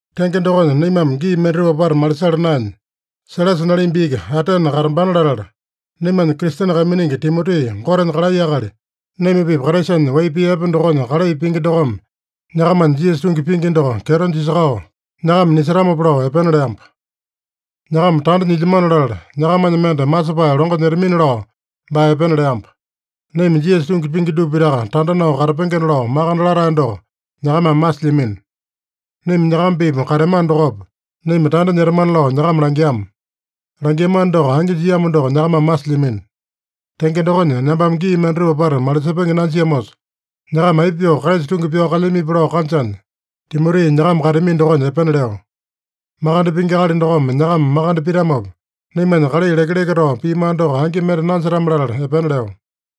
Tenge dokonya, naimame gii mendatupa apata malisala naenya, Sailasa nalimba iki Atene katambana latala, naimanya Kristene kaiminingi Timoti, Gotenya kalai akali, naima-pipa Kraisanya wai pii epe dokonya kalai pingi dokome, nyakamanya Jisasa tungi pingi doko kyeto jisakao nyakama nisetamopa lao epena leamba. Nyakama tanda nyilyamano latala, nyakamanya mende masepae longo nyetamini-lao baa epena leamba. Naima Jisasa tungi pingi dupa pitaka tanda nao katapengena lao makande latae doko nyakamame masilyamino. Naima nyakama-pipa kateamano dokopa, naima tanda nyetamana lao nyakama langiama. Langiamano doko angi jiamo doko nyakamame masilyamino. Tenge dokonya, nambame gii mendatupa apata malisepenge nanjiamosa, nyakama aipa pyoo Kraisa tungi pyao kalyamipi lao kanjanya, Timoti nyakama kateami dokonya epena leo. Makande pingi akali dokome nyakama makande pitamopa, naimanya kalai lekeleke tao piamano doko angi mende nanjetame-latala epena leo.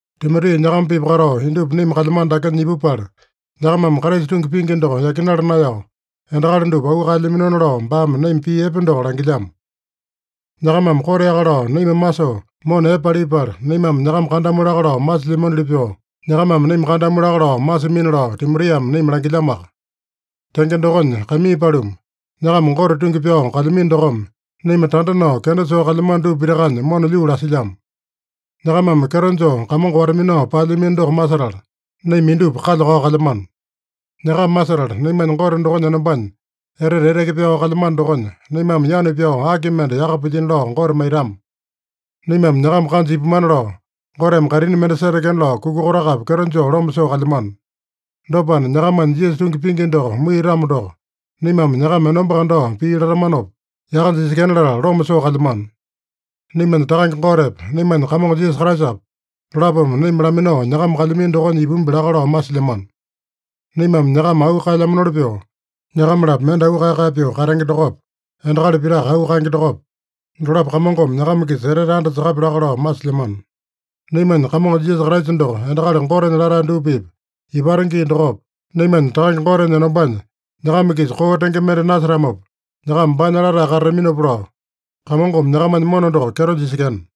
Timoti nyakama-pipa katao, indupa naima kalyamano dakenya ipupala, nyakamame Kraisa tungi pingi doko yakinala naeyao, endakali dupa auu kaelyaminona lao, baame naima pii epe doko langilyamo. Nyakamame koteaka lao naima masoo mona epe palipala, naimame nyakama kandamu laka lao masilyamanoli pyoo, nyakamame naima kandamu laka lao masimina lao Timotiame naima langilyamoaka. Tenge dokonya, kaimii paluma, nyakama Gote tungi pyao kalyamino dokome, naima tanda nao kenda soo kalyamano dupa pitakanya mona lyuu lasilyamo. Nyakamame kyeto joo Kamongo wata-minao paelyamino doko masetala, naima indupa kalya-kao kalyamano. Nyakama masetala, naimanya Gote dokonya enombanya etete eteke pyao kalyamano dokonya, naimame yanu pyao aki mende yaka pilyino lao Gote maitama? Naimame nyakama kanja ipumana lao, Goteme kaitini mende setekena lao kuka kotakapi kyeto joo loma soo kalyamano. Dopana, nyakamanya Jisasa tungi pingi doko muiyatamo doko, naimame nyakama enomba kandao pii latamanopa yaka jisekena latala, loma soo kalyamano. Naimanya Takange Gotepa, naimanya Kamongo Jisasa Kraisapa, dolapome naima laminao nyakama kalyamino dokonya ipumbi laka lao masilyamano. Naimame nyakama auu kaelyamanoli pyoo, nyakama-lapo mende auu kae-kae pyoo katenge dokopa, endakali pitaka auu kaenge dokopa, dolapo Kamongome nyakama-kisa etete andasakapya laka lao masilyamano. Naimanya Kamongo Jisasa Kraisa doko endakali Gotenya latae dupa-pipa ipata gii dokopa, naimanya Takange Gotenya enombanya nyakama-kisa koo tenge mende nasetamopa, nyakama baanya latae katataminopa lao, Kamongome nyakamanya mona doko kyeto jisekena.